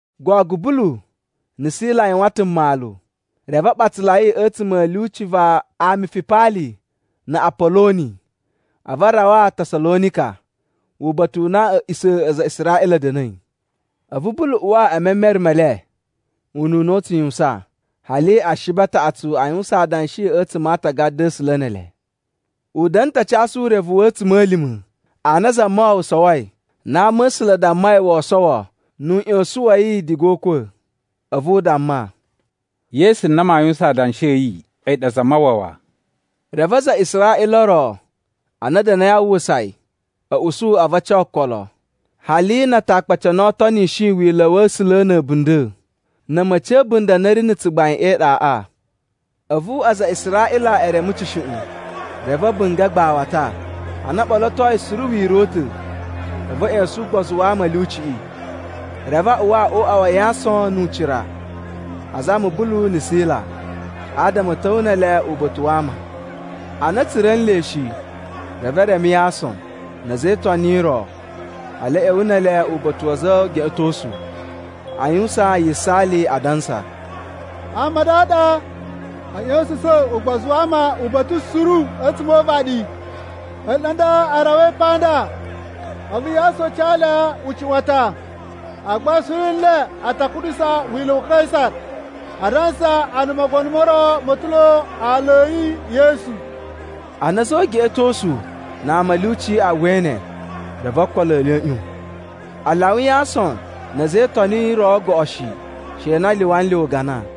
Gogo Bulu na̱ Sila a yuwan ta̱ mmalu reve a ɓatsalai a̱tsuma̱ a̱ lyuci va Amifipali na̱ Apoloni, a̱vu a rawa Tasalonika, uba̱ta̱ u na a̱a̱ꞌisa̱ a aza a Israꞌila a̱ da̱na̱i. A̱vu Bulu uwa e memere me le ununa u tsu yuwusan, hali Ashibi a taꞌatsu a yuwusan adanshi a̱tsuma̱ a Aatagada a̱ A̱sula̱ ne ele. U da̱na̱ ta̱ a casu urevu wa̱ a̱tsuma̱lima̱ a na Zamawawa sowoi na ama̱sula̱ a dammai woo sowo nu uꞌyosun wa̱ yi diga o ukwa̱, a̱vu u damma, “Yesu na maa yuwusan adanshi a̱ yi, a̱yi ɗa Zamawawa.” Reve aza a Israꞌila o ro a na a̱ da̱na̱i a uwwusa yi a̱ usu a̱vu a ca okolo, hali na Atakpaci a na o tonishi Wila̱ wa̱ A̱sula̱ na̱ a̱bunda̱, na̱ a̱ma̱ci a̱ a̱bunda̱ a na a̱ ri na̱ tsugbain e iɗaꞌa. A̱vu aza a Israꞌila e reme tsushuꞌun, reve a̱ bunga̱ agbawata. Ana o ɓolotoi suru wira̱ u ta̱, a̱vu a̱ ꞌya̱sa̱n ugbozu wa ama a̱ lyuciꞌi. Reve a uwa o uꞌwa wa Yason nu ucira, azama Bulu na̱ Sila, adama a̱ ta̱wa̱ ne ele uba̱ta̱ wa ama. Ana a̱ tsura̱ nle shi, reve e reme Yason na̱ a̱za̱ e Itoni o ro, hali a̱ ꞌya̱wa̱ ne ele uba̱ta̱ wa̱ a̱za̱ o ugeꞌetosu, a yuwusan yisaali, adansa, “Ama a nda a ɗa a̱ ꞌya̱sa̱sa̱n ugbozu wa ama uba̱ta̱ suru a̱tsuma̱ o uvaɗi, ele ɗa nda a rawai pa nda. A̱vu Yason ca le ucuꞌwatan. Agba suru nle a ta kuɗusa wila̱ wa Kaisa, adansa a na mogono mo ro ma̱ ta̱ lo aala a̱ yi Yesu.” Ana a̱za̱ o ugeꞌetosu na ama a̱ lyuci a uwwai ne, reve okolo e le a̱ ꞌyon. A lyawa Yason na̱ a̱za̱ e Itoni o roꞌo goꞌo shi, she na a lyuwa nle ugana.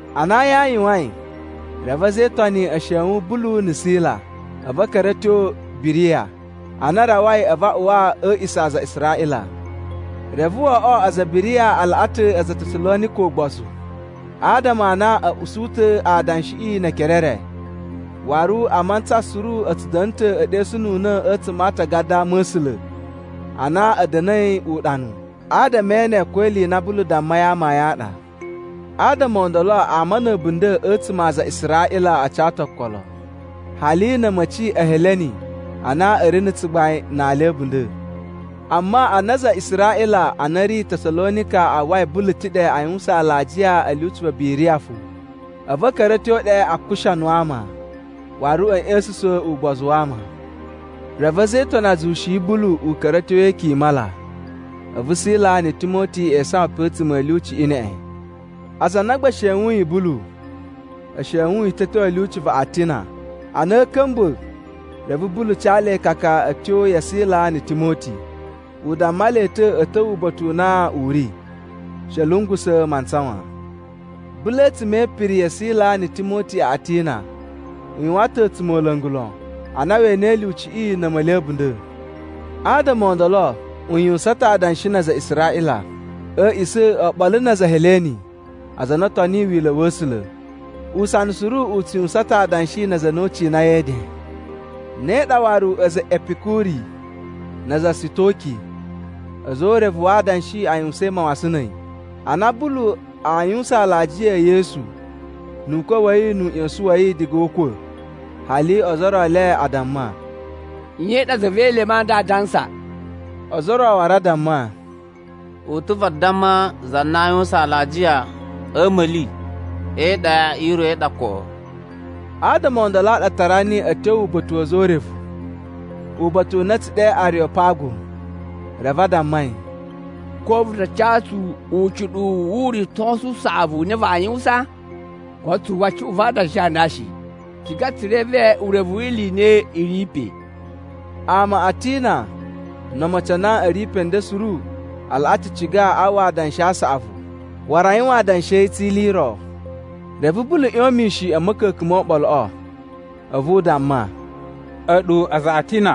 Ana ayin a yuwain, reve a̱za̱ e Itoni a̱ shewun Bulu na̱ Sila, a̱vu a̱ ka̱ra̱ a̱ tyo Biriya. Ana a rawai, a̱vu a uwa a̱ a̱a̱ꞌisa̱ a aza a Israꞌila. Reve wo oꞌwo aza a Biriya a laꞌa ta̱ aza a Tasalonika ugbozu, adama a na a̱ usu ta̱ adanshiꞌi ne ekere e re. Waru a mantsa suru a̱ tsu da̱na̱ ta̱ e ɗesununa̱ a̱tsuma̱ a Atagada a Ama̱sula̱ a na a̱ da̱na̱i uɗanu, adama e ene ko ili i na Bulu dammai amayun a ɗa. Adama o ndolo ama na̱ a̱bunda̱ a̱tsuma̱ a aza a Israꞌila a ca ta̱ okolo, hali na̱ a̱ma̱ci a Heleni a na a̱ ri na̱ tsugbain na ali a̱ a̱bunda̱. Amma ana aza a Israꞌila a na a̱ ri Tasalonika a uwwai Bulu ta̱ ɗe, a yuwusan alajiya a̱ lyuci va Biriya fo, a̱vu a̱ ka̱ra̱ a̱ tyo ɗe a kushanu ama, waru a̱ ꞌya̱sa̱sa̱n ugbozu wa ama. Reve a̱za̱ e Itoni a zuwushi Bulu u ka̱ra̱ a̱ tyo e ikyun i mala, a̱vu Sila na̱ Timoti e isawan pe a̱tsuma̱ a̱ lyuciꞌi neꞌen. Aza a na gba e shewuyin Bulu, e shewun yi ta̱ a̱ tyo a̱ lyuci va Atina. Ana a̱a̱ ka̱mba̱, reve Bulu ca le ikaka a̱ tyo ya Sila na̱ Timoti. U damma le ta̱ a̱ ta̱wa̱ uba̱ta̱ u na u ri, she a̱ lungusa̱ mantsa wan. Bulu a̱tsuma̱ e ipiri ya Sila na̱ Timoti a Atina, u yuwan ta̱ a̱tsumola̱ngu lon, ana we enei lyuciꞌi na̱ a̱ma̱li a̱bunda̱. Adama o ndolo u yuwusan ta̱ adanshi na aza a Israꞌila a̱ a̱a̱ꞌisa̱ oɓolo na aza a Heleni aza a na o toniyi Wila̱ wa̱ A̱sula̱. Usana suru u tsu yuwusan ta̱ adanshi na aza a na u cinai e eden. Ne ɗa waru a̱za̱ e Epikuri na aza a Sitoki a̱za̱ o urevu wa adanshi a yuwusain mawasan na̱ a̱yi. Ana Bulu aa yuwusan alajiya e Yesu nu ukwa̱ wa̱ yi nu uꞌyosun wa̱ yi diga o ukwa̱. Hali ozo o ro e le a damma, “Nye i ɗa za ve elemu a nda aa dansa?” Ozo o ro waru a damma, “U ta̱ vadamma za na a yuwusan alajiya a̱ a̱ma̱li e iɗa i ro ɗa koꞌo.” Adama o ndolo a ɗa a tara niyi a̱ tyo uba̱ta̱ wa̱ a̱za̱ o urevu, uba̱ta̱ u na a̱ tsu ɗe Ariyopagu. Reve a damma yi, “Ko vu ta ca tsu ucuɗuwu wu uritosu u saꞌavu u na vaa yuwusan? Koto tsu uwwa cuꞌun va adanshi a nda shi. Tsu ciga ta̱ tsu reve urevu wi ili i na i ri pe.” Ama a Atina no omocin a na a̱ ri pe nden suru, a laꞌa ta̱ ciga a uwwa adanshi a saꞌavu waru a yuwan adanshi a̱ yi tsi ili i ro. Reve Bulu ꞌyon mishin a̱ ma̱ka̱ka̱n mo oɓoloꞌo, a̱vu u damma, “A̱ɗu aza a Atina,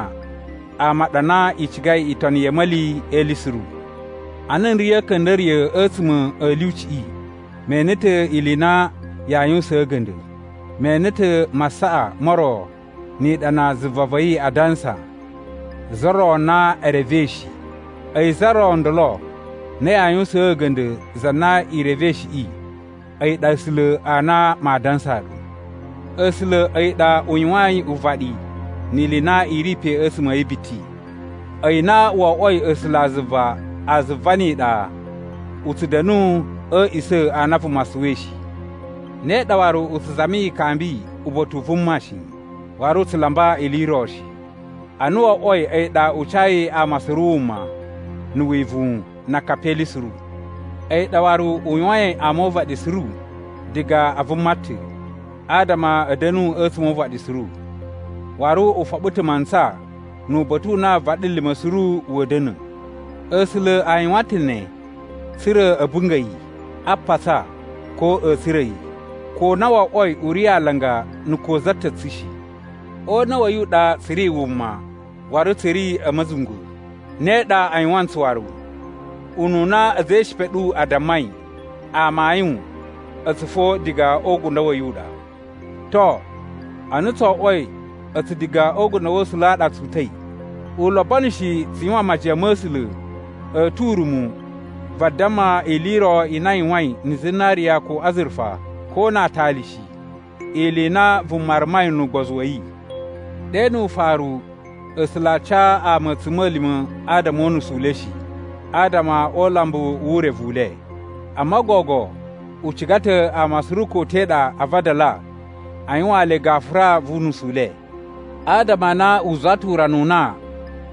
ama a ɗa a na i cigai itoni ya̱ a̱ma̱li e ili suru. Ana n ri a̱ a̱ka̱nda̱riya̱ a̱tsuma̱ a̱ lyuciꞌi, me ene ta̱ ili i na yaa yuwusaan a̱ga̱nda̱. Me ene ta̱ masaꞌa mo ro ni iɗana zuva va̱ yi adansa, ‘Za Ro na e Revei Shi.’ A̱yi za ro ndolo na yaa yuwusaan a̱ga̱nda̱ za na i revei shiꞌi, a̱yi ɗa A̱sula̱ a na maa dansaa ɗu. “A̱sula̱ a̱yi ɗa u yuwain uvaɗi ni ili i na i ri pe a̱tsuma̱ a̱ yi biti. A̱yi na wo oꞌwoi A̱sulazuva a zuva ni iɗa, u tsu da̱nu a̱ a̱a̱ꞌisa̱ a na vuma suwai shi. Ne ɗa waru u tsu zami ikambi uba̱ta̱ u vuma shi, waru u tsu lamba ili i ro shi. Ana wo oꞌwoi a̱yi ɗa u cayi ama suru wuma, na̱ wivuwun na akapi e ili suru. A̱yi ɗa waru u yuwain ama o uvaɗi suru diga a vuma ta̱, adama a̱ da̱nu a̱tsuma̱ o uvaɗi suru. Waru u foɓo ta̱ mantsa nu uba̱ta̱ u na vaɗilima̱ suru wa̱a̱ da̱na̱. “A̱sula̱ a yuwan ta̱ ne tsa̱ra̱ a̱ bunga̱ yi, a patsa, ko a̱ tsura̱ yi, ko na wo oꞌwoi u ri alanga na̱ ko za ta̱ tsu shi. O una̱ wa̱ yi u ɗa tsu ri wuma, waru tsu ri a̱ ma̱zungwa̱, ne ɗa a yuwan ntsu waru. Ununa a̱za̱ e ishipa a̱ ɗu a dammai, ‘Amayun, a̱tsu fo diga o ugundo wa̱ yi u ɗa.’ “To, ana tso oꞌwoi a̱tsu diga o ugundo wa̱ A̱sula̱ a ɗa tsu uta̱i, u lobono shi tsu yuwan majiyan ma̱ A̱sula̱ a̱ tu urumu vadamma ili i ro i na a yuwain na̱ zinariya ko azurufa, ko na aatali shi, ili i na vuma rumai nu ugbozu wa̱ yi. Ɗe nu ufaru A̱sula̱ a ca ama a̱tsuma̱lima̱ adama o unusu u le shi, adama o ulambu wu urevu u le. Amma gogo u ciga ta̱ ama suru ko te ɗa a vadala a yuwaan le gafura vu unusu u le. “Adama a na u zuwa ta̱ urana u na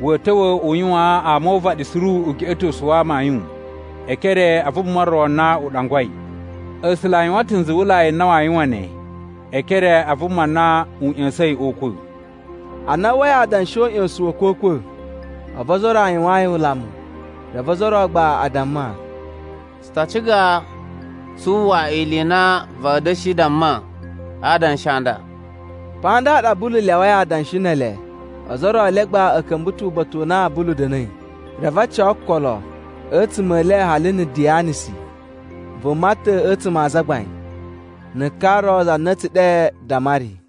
wa̱a̱ ta̱wa̱ u yuwaan ama o uvaɗi suru ugeꞌetosu wa amayun e ekere a vuma ro na u ɗangwai. A̱sula̱ a yuwan ta̱ nzuwulai n na waa yuwan ne, e ekere a vuma na u ꞌya̱sa̱in o ukwa̱.” Ana a uwwai adanshi o uꞌyosun wa̱ a̱kwa̱kwa̱, a̱vu ozo o ro a yuwaan yi ulamu, reve ozo o ro gba a damma, “Tsu ta ciga tsu uwwa ili i na va̱a̱ da̱shi damma a adanshi a nda.” Pa nda ɗa Bulu lyawai adanshi ne ele. Ozo o ro e le gba a̱ ka̱mba̱ ta̱ uba̱ta̱ u na Bulu da̱na̱i, reve a ca okolo a̱tsuma̱ e le hali na̱ Diyanisi, vuma ta̱ a̱tsuma̱ a azagbain, na̱ ka ro za na a̱ tsu ɗe Damari.